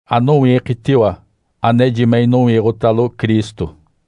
Anowiikitiwa, aneji me inowiiɡ̶otalo Cristo.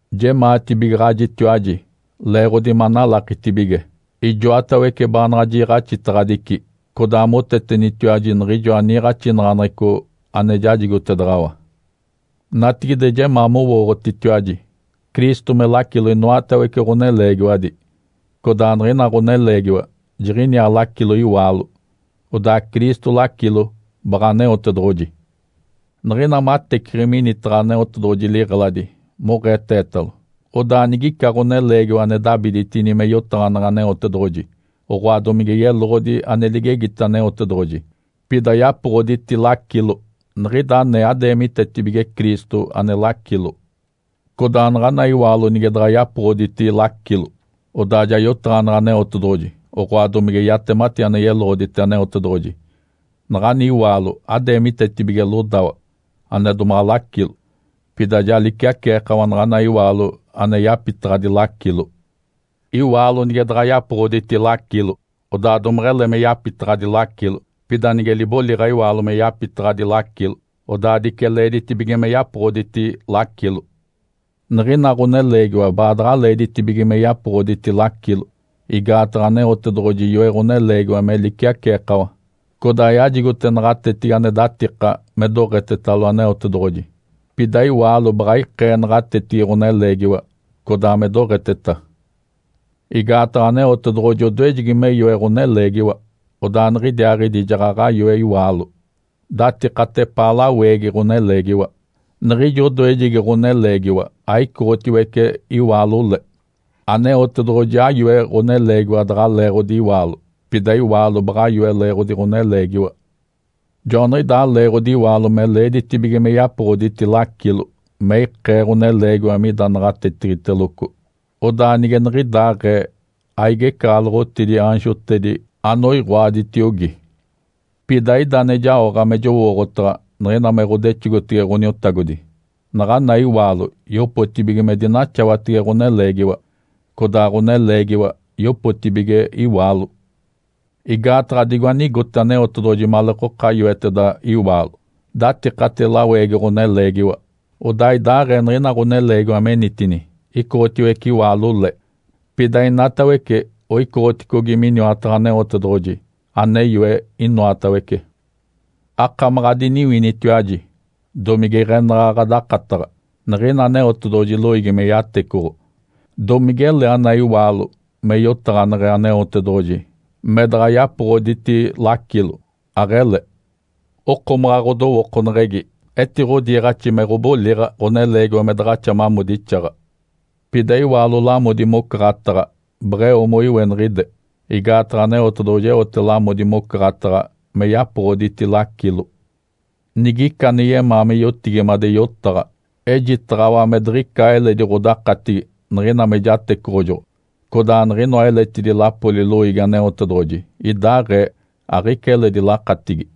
Jemaatibigaɡ̶ajitiwaji leeɡ̶odi manalakitibige ijoatawece baanaɡ̶a jiiɡ̶axitedaɡ̶adici, codaa motetenitetiwaji niɡ̶ijoa niiɡ̶axinaɡ̶aneɡ̶eco ane jajigotedaɡ̶awa. Natigide, jemaa mowooɡ̶otitiwaji Cristo me lacilo inoatawece ɡ̶oneleegiwadi, codaa niɡ̶ina ɡ̶oneleegiwa jiɡ̶iniaa lacilo iwaalo, odaa Cristo lacilo baɡ̶a Aneotedoɡ̶oji. Niɡ̶ina mateciɡ̶i minitaɡ̶a Aneotedoɡ̶oji liɡ̶eladi moɡ̶eetetalo, odaa nigica ɡ̶oneleegiwa ane dabiditini me yotaɡ̶aneɡ̶e Aneotedoɡ̶oji, oɡ̶oa domige yeloɡ̶odi ane ligegite Aneotedoɡ̶oji, pida yapoɡ̶oditi lacilo, niɡ̶ida anee adeemitetibige Cristo ane lacilo. Codaa naɡ̶ana iwaalo nige daɡ̶a yapoɡ̶oditi lacilo, odaa ja yotaɡ̶aneɡ̶e Aneotedoɡ̶oji, oɡ̶oa domige yatemati ane yeloɡ̶odite Aneotedoɡ̶oji, naɡ̶ani iwaalo adeemitetibige lodawa, ane domaɡ̶a lacilo. Pida ja liciaceekawa naɡ̶ana iwaalo ane yapitaɡ̶adi lacilo. Iwaalo nige daɡ̶a yapoɡ̶oditi lacilo, odaa domeɡ̶ele me yapitaɡ̶adi lacilo. Pida nige liboliɡ̶a iwaalo me yapitaɡ̶adi lacilo, odaa dice leeditibige me yapoɡ̶oditi lacilo. Niɡ̶ina ɡ̶oneleegiwa baadaɡ̶a leeditibige me yapoɡ̶oditi lacilo, igaataɡ̶a Aneotedoɡ̶oji yoe ɡ̶oneleegiwa me liciaceekawa, codaa yajigote naɡ̶atetigi ane datika me doɡ̶etetalo Aneotedoɡ̶oji. Pida iwaalo baɡ̶a ikee naɡ̶atetigi ɡ̶oneleegiwa, codaa me doɡ̶eteta. Igaataɡ̶a Aneotedoɡ̶oji odoejegi me yoe ɡ̶oneleegiwa, odaa niɡ̶idiaaɡ̶idi jaɡ̶aɡ̶a yoe iwaalo, datikate epaa laweegi ɡ̶oneleegiwa. Niɡ̶ijo odoejegi ɡ̶oneleegiwa aicoɡ̶otiwece iwaalo le. Aneotedoɡ̶oji ayoe ɡ̶oneleegiwa daɡ̶a leeɡ̶odi iwaalo, pida iwaalo baɡ̶a yoe leeɡ̶odi ɡ̶oneleegiwa. Joaniɡ̶idaa leeɡ̶odi iwaalo me leeditibige me yapoɡ̶oditi lacilo me ikee ɡ̶oneleegiwa mida naɡ̶atetigiteloco, odaa nige niɡ̶idaaɡ̶ee aigecaɡ̶aloɡ̶otidi aanjotedi anoiɡ̶oaditiogi. Pida ida ane jaoɡ̶a me jowooɡ̶otaɡ̶a niɡ̶ina me ɡ̶odexogotege Ǥoniotagodi, naɡ̶ana iwaalo yopotibige me dinaxawatege ɡ̶oneleegiwa, codaa ɡ̶oneleegiwa yopotibige iwaalo. Igaataɡ̶a digo anigote Aneotedoɡ̶oji maleekoka yoeteda iwaalo datikate laweegi ɡ̶oneleegiwa, odaa idaaɡ̶ee niɡ̶ina ɡ̶oneleegiwa menitini, icoɡ̶otiwece iwaalo le. Pida inatawece oicoɡ̶oticogi miniwataɡ̶a Aneotedoɡ̶oji ane yoe inoatawece. Akamaɡ̶a adiniwinitiwaji domige iɡ̶enaɡ̶a ɡ̶adakataɡ̶a! Niɡ̶ina Aneotedoɡ̶oji loiigi me yatecoɡ̶o, domigele ana iwaalo me yotaɡ̶aneɡ̶e Aneotedoɡ̶oji me daɡ̶a yapoɡ̶oditi lacilo? Aɡ̶ele! Okomaɡ̶a ɡ̶odowookoneɡ̶egi etiɡ̶odiiɡ̶axi me ɡ̶oboliɡ̶a ɡ̶oneleegiwa me daɡ̶axa mamodixaɡ̶a. Pida iwaalo lamodi mocaɡ̶ataɡ̶a beɡ̶eo moiweniɡ̶ide. Igaataɡ̶a Aneotedoɡ̶oji eote lamodi mocaɡ̶ataɡ̶a me yapoɡ̶oditi lacilo. Nigica ane yemaa me yotigimade yotaɡ̶a, ejitaɡ̶awa me diɡ̶ica eledi ɡ̶odakatigi niɡ̶ina me jatecoɡ̶ojoɡ̶o, codaa niɡ̶inoa eletidi lapoli loiigi Aneotedoɡ̶oji idaaɡ̶ee aɡ̶ica eledi lakatigi.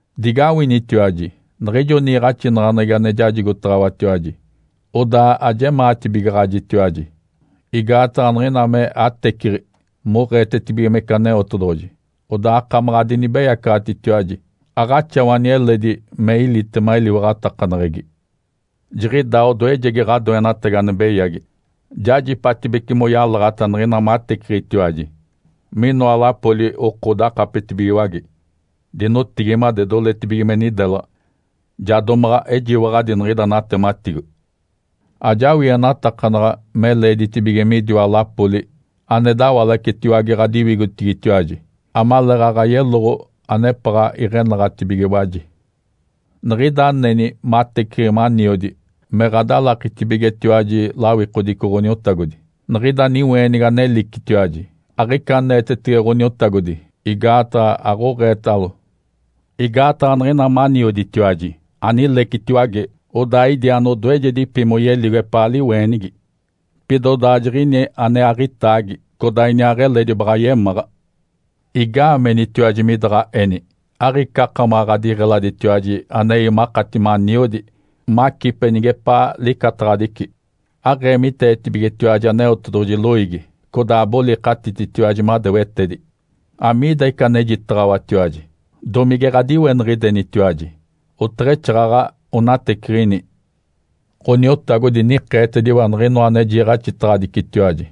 Digawinitiwaji! Niɡ̶ijo niiɡ̶axinaɡ̶aneɡ̶egi ane jajigotaɡ̶awatiwaji, odaa ajemaatibigaɡ̶ajitiwaji, igaataɡ̶a niɡ̶ina me ateciɡ̶i moɡ̶eetetibigimece Aneotedoɡ̶oji, odaa akamaɡ̶a adinibeyacaɡ̶atitiwaji, aɡ̶axawani eledi me ilitema eliwaɡ̶atakaneɡ̶egi. Jiɡ̶idaa odoejegi ɡ̶adoenatagi ane beyagi. Jajipatibece moyalaɡ̶ata niɡ̶ina mateciɡ̶itiwaji, minoa lapoli oko dakapetibigiwage, dinotigimade, doletibige me nidelaɡ̶a. Ja domaɡ̶a ejiwaɡ̶adi niɡ̶ida natematigo. Ajawienatakanaɡ̶a me leeditibige midiwa lapoli ane dawalacetiwage ɡ̶adiwigotigitiwaji amaleeɡ̶aɡ̶a yeloɡ̶o anepaɡ̶a iɡ̶enaɡ̶atibigiwaji. Niɡ̶ida aneni mateciɡ̶i maniodi me ɡ̶adalakitibigetiwaji lawikodico Ǥoniotagodi, niɡ̶ida niweenigi anelicitiwaji aɡ̶ica aneetetege Ǥoniotagodi, igaataɡ̶a aɡ̶oɡ̶eetalo. Igaataɡ̶a niɡ̶ina manioditiwaji, anilecitiwage, odaa idi anodoejedipi moyeligo epaa liweenigi. Pida odaa jiɡ̶ini ane aɡ̶itaagi, codaa iniaaɡ̶eledi baɡ̶a yemáɡ̶a. Igaamenitiwaji midaɡ̶a eni? Aɡ̶ica akamaɡ̶a ɡ̶adiɡ̶eladitiwaji anei makati maniodi, macipe nigepaa licataɡ̶adici? Aɡ̶eemiteetibigetiwaji Aneotedoɡ̶oji loiigi, codaa abolikatititiwaji madewetedi. Amiida ica anejitaɡ̶awatiwaji? Domige ɡ̶adiweniɡ̶idenitiwaji? Oteɡ̶exaaɡ̶aɡ̶a onateciɡ̶ini! Ǥoniotagodi nikeetediwa niɡ̶inoa ane jiiɡ̶axitaɡ̶adicitiwaji.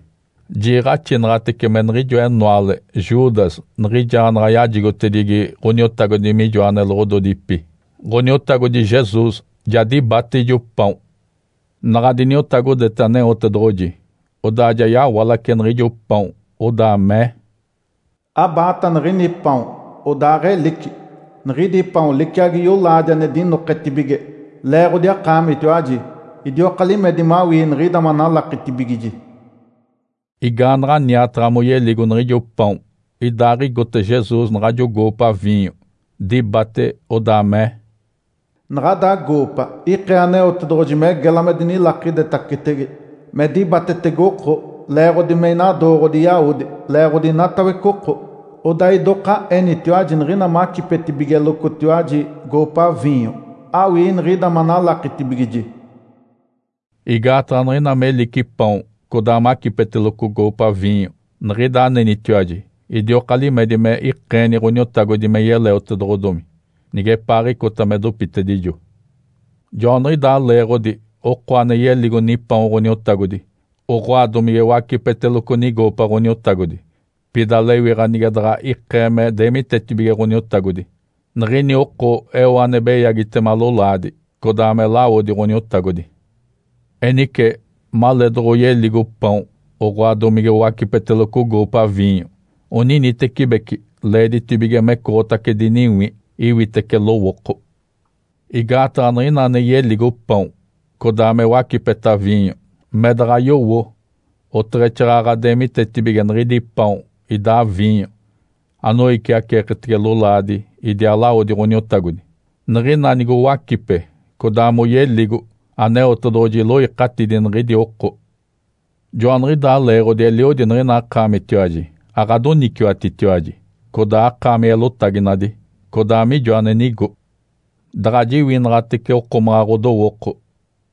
Jiiɡ̶axinaɡ̶atece me niɡ̶ijo enoale Judas niɡ̶ijaanaɡ̶a yajigotedigi Ǥoniotagodi mijoa neloɡ̶ododipi, Ǥoniotagodi Jesus ja dibate ijo paon. Naɡ̶a diniotagodete Aneotedoɡ̶oji, odaa ja yawalace niɡ̶ijo paon, odaa mee, “Abaata niɡ̶ini paon, odaaɡ̶elici! Niɡ̶idi paon liciagi yolaadi ane dinoketibige leeɡ̶odi akaamitiwaji. Idioka limedi mawii niɡ̶ida manalakitibigiji.” Igaanaɡ̶a niataɡ̶a moyeligo niɡ̶ijo paon, idaaɡ̶igote Jesus naɡ̶ajo goopa viinyo, dibate, odaa mee, “Naɡ̶ada goopa ikee Aneotedoɡ̶oji me gela me dinilakidetacetege me dibatetege oko leeɡ̶odi me inadooɡ̶odi yawodi leeɡ̶odi inatawece oko. Odaa idoka enitiwaji niɡ̶ina macipetibigelocotiwaji goopa viinyo awii niɡ̶ida manalakitibigiji.” Igaataɡ̶a niɡ̶ina melici paon codaa macipeteloco goopa viinyo, niɡ̶ida anenitiwaji, idioka limedi me ikeeni Ǥoniotagodi me yeleotedoɡ̶odomi nigepaaɡ̶icota me dopitedijo. Joaniɡ̶idaa leeɡ̶odi oko ane yeligo nipaon Ǥoniotagodi oɡ̶oa domige wacipeteloco nigoopa Ǥoniotagodi, pida lewiɡ̶a nige daɡ̶a ikee me deemitetibige Ǥoniotagodi, niɡ̶ini oko eo ane beyagitema lolaadi codaa me lawodi Ǥoniotagodi. Enice maleedoɡ̶oyeligo paon oɡ̶oa domige owacipeteloco goopa viinyo, oninitecibeci leeditibige mecoɡ̶otace diniwi, iwitece lowooko. Igaataɡ̶a niɡ̶ina ane yeligo paon codaa me wacipeta viinyo me daɡ̶a yowo oteɡ̶exaaɡ̶aɡ̶a deemitetibige niɡ̶idi paon idaa viinyo anoiciaceeketege lolaadi idiaa lawodi Ǥoniotagodi, niɡ̶ina nigowacipe codaa moyeligo, Aneotedoɡ̶oji iloikatidi niɡ̶idi oko. Joaniɡ̶idaa leeɡ̶odi eliodi niɡ̶ina akaamitiwaji aɡ̶adoniciwatitiwaji codaa akaami eelotaginadi, codaa mijo ane nigo. Daɡ̶a jiwinaɡ̶atece okomaɡ̶a ɡ̶odowooko,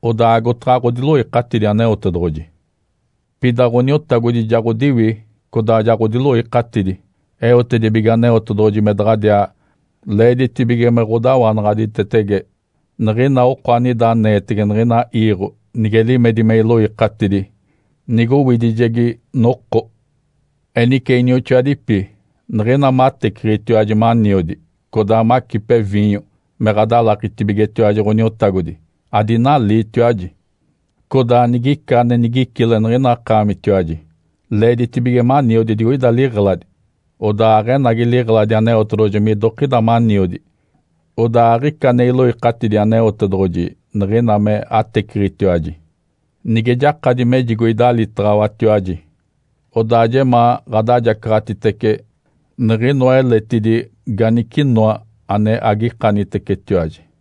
odaa agotaɡ̶a ɡ̶odiloikatidi Aneotedoɡ̶oji. Pida Ǥoniotagodi ja ɡ̶odiwi codaa ja ɡ̶odiloikatidi eotedibige Aneotedoɡ̶oji me daɡ̶adiaa leeditibige me ɡ̶odawanaɡ̶aditetege niɡ̶ina oko anida aneetege niɡ̶ina iiɡ̶o nige limedi me iloikatidi nigowidijegi noko. Enice, inioxoadipi, niɡ̶ina mateciɡ̶itiwaji maniodi, codaa macipe viinyo me ɡ̶adalakitibigetiwaji Ǥoniotagodi, adinaliitiwaji. Codaa nigica ane nigicile niɡ̶ina akaamitiwaji, leeditibige maniodi digoida liɡ̶eladi, odaa aɡ̶enagi liɡ̶eladi Aneotedoɡ̶oji midokida maniodi, odaa aɡ̶ica ane iloikatidi Aneotedoɡ̶oji niɡ̶ina me ateciɡ̶itiwaji. Nige jakadi mejigo idalitaɡ̶awatiwaji, odaa jemaa ɡ̶adajacaɡ̶atitece niɡ̶inoa eletidi ganicinoa ane agikanitecetiwaji.